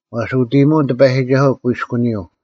ᐛᔅ ᐅᑦ ᐃᔨᒧᐅᓐ ᑎᐸᔨᒋᒐᓱᐤ ᑯᐃᔅᑯᓂᔪᐤ;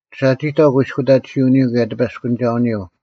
ᓴᒋᑕᐤ ᑯᐃᔅᑯᑕᑎᓯᐅᓂᔪᐤ ᑭᔭ ᑎᐸᔅᑯᓂᒐᐅᓂᔪᐤ: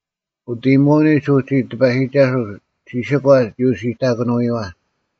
ᐅᑦ ᐃᔨᒧᐅᓂᒡ ᐅᒋ ᑎᐸᔨᒋᒐᓱᐤ ᒋᓯᒂ ᒋ ᐅᓯᑕᑭᓄᐎᔪᐛ: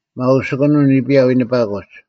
ᒪᐅᓯᑯᓂᒻ ᓂᐱᔭ ᐎᓂᐸᑯᒡ: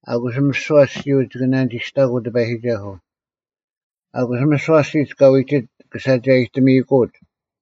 ᐊᑯᔅ ᒥᓯᐛ ᐊᔅᒋᔪᐤ ᒋᑭ ᓇᓂᒋᔅᑕᑯᐤ ᑎᐸᔨᒋᒐᓱᐤ; ᐊᑯᔅ ᒥᓯᐛ ᐊᔅᒋᒡ ᑲ ᐎᒋᒡ ᒋᑭ ᓴᒐᔨᑕᒥᐃᑯᐅᒡ: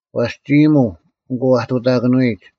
ᐛᔅ ᒋ ᐃᔨᒧᐤ, ᐊᑯ ᐊᑐᑕᑭᓄᐎᒡ;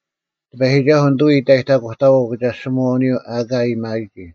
ᑎᐸᔨᒋᒐᓱᐤ ᓂᑐᐎ ᐃᑕᔨᑕᑯᑕᐛᐤ ᐅᑭᒐᔅᒋᒧᐛᐅᓂᔪᐤ ᐊᑲ ᐊᔭᒥᐊᔨᒋ: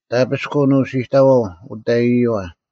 ᑕᐱᔅᑯᓐ ᐅᓯᑕᐛᐤ ᐅᑕᐃᔪᐛ;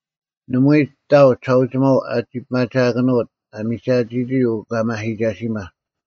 ᓇᒪᐎᔾ ᑕᐤ ᒋᓴᐅᒋᒪᐤ ᐊᒋ ᐱᒪᒋᐊᑭᓄᐅᑦ ᐊ ᒥᒐᑎᔨᒋ ᐅᑲᒪᓯᒐᓯᒪ: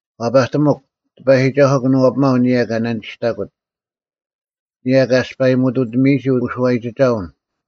ᐛᐸᑎᒧᒄ, ᑎᐸᔨᒋᒐᓱᐤ ᑭᓄᐛᐱᒪᐤ ᐊᓂᔭ ᑲ ᓇᓂᒋᔅᑕᑯᑦ, ᐊᓂᔭ ᑲ ᐊᔅᐸᔨᒧᑐᑎᒥᔨᒋ ᐅᓱᐛᔨᒋᒐᐅᓐ;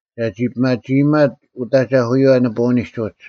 ᒐᒋ ᐱᒪᒋᐃᒪᑦ ᐅᑦ ᐊᒐᐧᑯᔪᐛ ᓂᐳᐅᓂᒡ ᐅᒡ,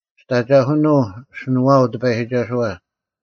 ᒋᑦ ᐊᒐᐧᑯᓄᐤ ᐊᓯᓄᐛᐊᐤ ᑎᐸᔨᒋᒐᓱᐛ;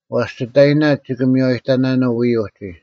ᐛᔅ ᒋᑕᐃᓇᒡ ᒋᑭ ᒥᔽᔨᑕᓇᓄᐤ ᐎᔾ ᐅᒋ,